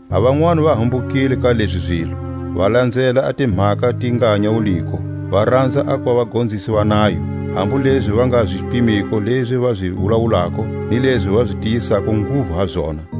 A vanwani va hambukile ka lezi zilo, va lanzela a timhaka ti nga nyawuliko, va ranza a kuva vagonzisi va nayo, hambu lezi va nga zi pimiko lezi va zi wulawulako, ni lezi va tiyisako nguvu ha zona.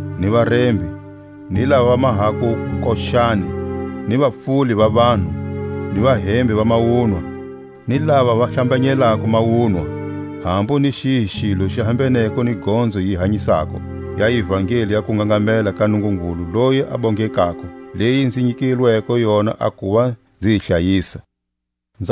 ni varembi, ni lava va mahako wukochani, ni vapfuli va vanhu, ni vahembi va mawunwa, ni lava va hlambanyelako mawunwa, hambu ni xihi xilo xi hambeneko ni gonzo yi hanyisako ya ivangeli ya kungangamela ka Nungungulu loyi a bongekako, leyi nzi nyikilweko yona a kuva nzi yi hlayisa. A ntiro wa Paule.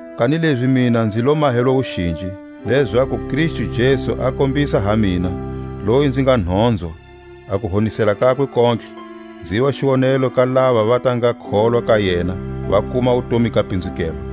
Kanilezi mina nzi lo mahelwa wuxinji, lezaku Kristu Jesu a kombisa ha mina, loyi nzi nga nhonzwa, a kuhonisela kakwe kontlhe, nziva xiwonelo ka lava va ta nga kholwa ka yena, va kuma a wutomi ga pinzukelwa.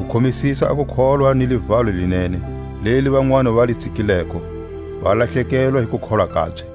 u khomisisa a kukholwa ni livalo li nene, leli vanwani va li tsikileko, va lahlekelwa hi kukholwa kabye.